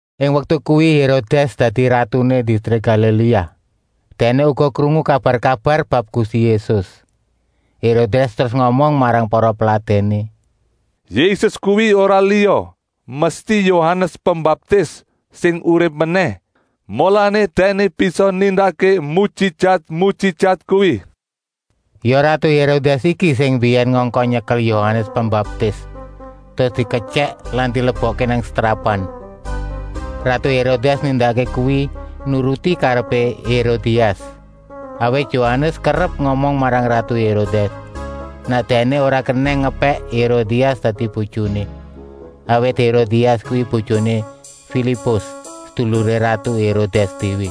Ing waktu kuwi Hérodès dadi ratuné distrik Galiléa. Dèkné uga krungu kabar-kabar bab Gusti Yésus. Hérodès terus ngomong marang para peladèné: “Yésus kuwi ora liya, mesti Yohanes Pembaptis, sing urip menèh. Mulané dèkné bisa nindakké mujijat-mujijat kuwi.” Ya ratu Hérodès iki sing mbiyèn ngongkon nyekel Yohanes Pembaptis, terus diketyèk lan dilebokké nang setrapan. Ratu Hérodès nindakké kuwi nuruti karepé Hérodias. Awit Yohanes kerep ngomong marang ratu Hérodès, nèk dèkné ora kenèng ngepèk Hérodias dadi bojoné, awit Hérodias kuwi bojoné Filipus, seduluré ratu Hérodès déwé.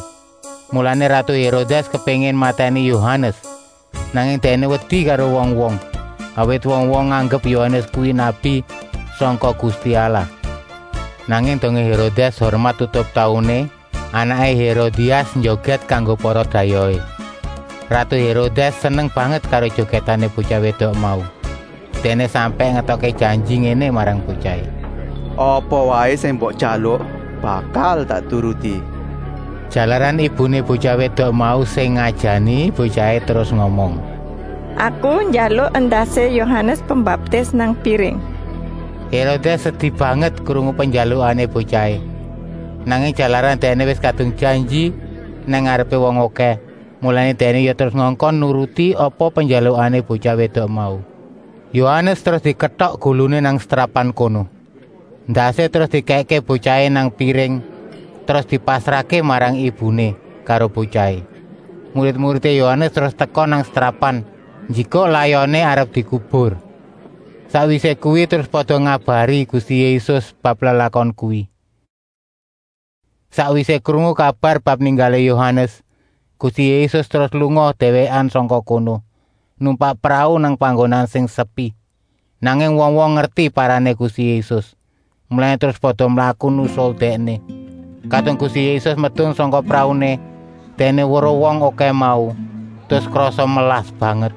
Mulané ratu Hérodès kepéngin matèni Yohanes, nanging dèkné wedi karo wong-wong, awit wong-wong nganggep Yohanes kuwi nabi sangka Gusti Allah. Nanging dongé Hérodès ngurmat tutup tauné, anaké Hérodias njogèt kanggo para dayohé. Ratu Hérodès seneng banget karo jogètané botyah wédok mau. Dèkné sampèk ngetokké janji ngéné marang botyahé: “Apa waé sing mbok jaluk bakal tak turuti.” Jalaran ibuné botyah wédok mau sing ngajani, botyahé terus ngomong: “Aku njaluk endasé Yohanes Pembaptis nang piring.” Hérodès sedi banget krungu penjaluké botyahé, nanging jalaran dèkné wis kadung janji nang ngarepé wong okèh, mulané dèkné ya terus ngongkon nuruti apa penjaluké botyah wédok mau. Yohanes terus diketok guluné nang setrapan kono. Endasé terus dikèkké botyahé nang piring, terus dipasrahké marang ibuné karo botyahé. Murid-muridé Yohanes terus teka nang setrapan njikuk layoné arep dikubur. Sakwisé kuwi terus pada ngabari Gusti Yésus bab lelakon kuwi. Sakwisé krungu kabar bab ninggalé Yohanes, Gusti Yésus terus lunga déwékan sangka kono, numpak prau nang panggonan sing sepi. Nanging wong-wong ngerti parané Gusti Yésus, mulané terus pada mlaku nusul Dèkné. Kadung Gusti Yésus medun sangka prauné, Dèkné weruh wong okèh mau, terus krasa melas banget.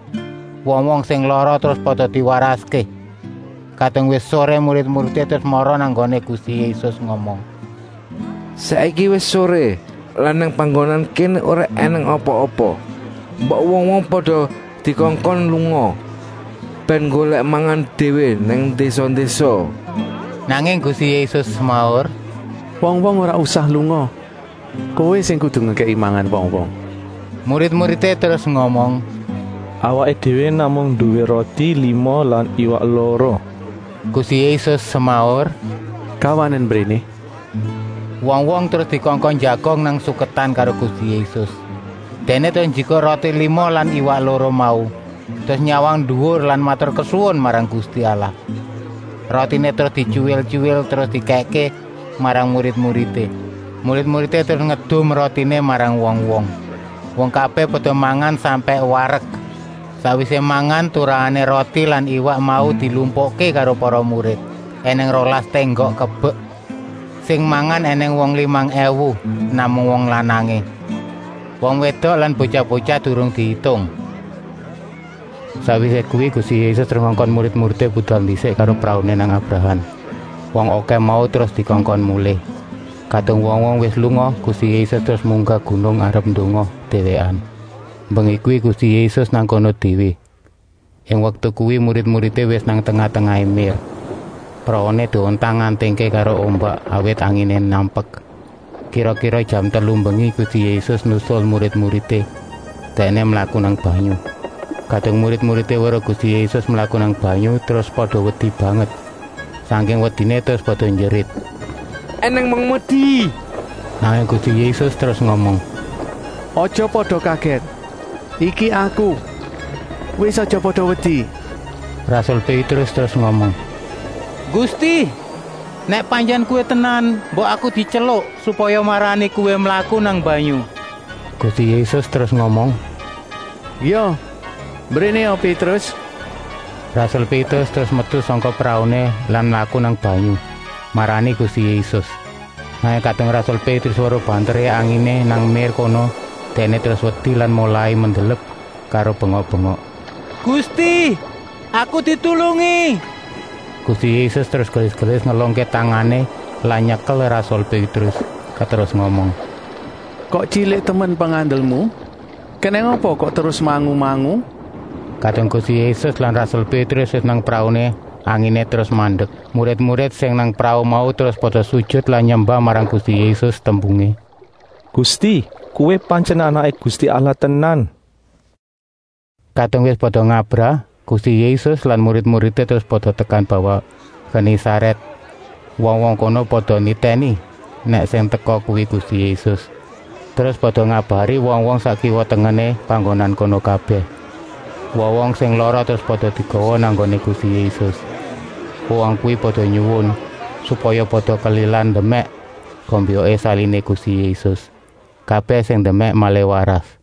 Wong-wong sing lara terus pada diwaraské. Kadung wis soré murid-muridé terus mara nang nggoné Gusti Yésus ngomong: “Saiki wis soré lan nang panggonan kéné ora ènèng apa-apa. Mbok wong-wong pada dikongkon lunga, bèn nggolèk mangan déwé nang désa-désa.” Nanging Gusti Yésus semaur: “Wong-wong ora usah lunga, kowé sing kudu ngekèki mangan wong-wong!” Murid-muridé terus ngomong: “Awaké déwé namung nduwé roti lima lan iwak loro!” Gusti Yésus semaur: “Gawanen mbréné!” Wong-wong terus dikongkon njagong nang suketan karo Gusti Yésus. Dèkné terus njikuk roti lima lan iwak loro mau, terus nyawang nduwur lan maturkesuwun marang Gusti Allah. Rotiné terus dityuwil-tyuwil, terus dikèkké marang murid-muridé. Murid-muridé terus ngedum rotiné marang wong-wong. Wong kabèh pada mangan sampèk warek. Sakwisé mangan, turahané roti lan iwak mau dilumpukké karo para murid, ènèng rolas ténggok kebek. Sing mangan ènèng wong limang èwu, namung wong lanangé, wong wédok lan botyah-botyah durung diitung. Sakwisé kuwi Gusti Yésus terus ngongkon murid-muridé budal ndisik karo prauné nang abrahan. Wong okèh mau terus dikongkon mulih. Kadung wong-wong wis lunga, Gusti Yésus terus munggah gunung arep ndonga, déwékan. Mbengi kuwi Gusti Yésus nang kono déwé. Ing waktu kuwi murid-muridé wis nang tengah-tengah mér. Prauné diontang-antingké karo ombak, awit anginé nampek. Kira-kira jam telu mbengi Gusti Yésus nusul murid-muridé, Dèkné mlaku nang banyu. Kadung murid-muridé weruh Gusti Yésus mlaku nang banyu, terus pada wedi banget. Sangking wediné terus pada njerit: “Enèng mokmedi!” Nanging Gusti Yésus terus ngomong: “Aja pada kagèt. Iki Aku. Wis aja pada wedi!” Rasul Pétrus terus ngomong: “Gusti, nèk pantyèn Kowé tenan, mbok aku dityeluk supaya marani Kowé mlaku nang banyu!” Gusti Yésus terus ngomong: “Ya, mbrénéa Pétrus!” Rasul Pétrus terus metu sangka prauné lan mlaku nang banyu, marani Gusti Yésus. Nanging kadung rasul Pétrus weruh banteré anginé nang mér kono, dèkné terus wedi lan molai mendelep karo bengok-bengok: “Gusti, aku ditulungi!” Gusti Yésus terus gelis-gelis ngelungké tangané lan nyekel rasul Pétrus, terus ngomong: “Kok tyilik temen pengandelmu? Kenèng apa kok terus mangu-mangu?” Kadung Gusti Yésus lan rasul Pétrus wis nang prauné, anginé terus mandek. Murid-murid sing nang prau mau terus pada sujut lan nyembah marang Gusti Yésus tembungé: “Gusti, Kowé pantyèn Anaké Gusti Allah tenan!” Kadung wis pada ngabrah, Gusti Yésus lan murid-muridé terus pada tekan bawah Genésarèt. Wong-wong kono pada nitèni nèk sing teka kuwi Gusti Yésus, terus pada ngabari wong-wong sak kiwa-tengené panggonan kono kabèh. Wong-wong sing lara terus pada digawa nang nggoné Gusti Yésus. Wong-wong kuwi pada nyuwun, supaya pada kelilan ndemèk gombyoké saliné Gusti Yésus. Kabèh sing ndemèk malih waras.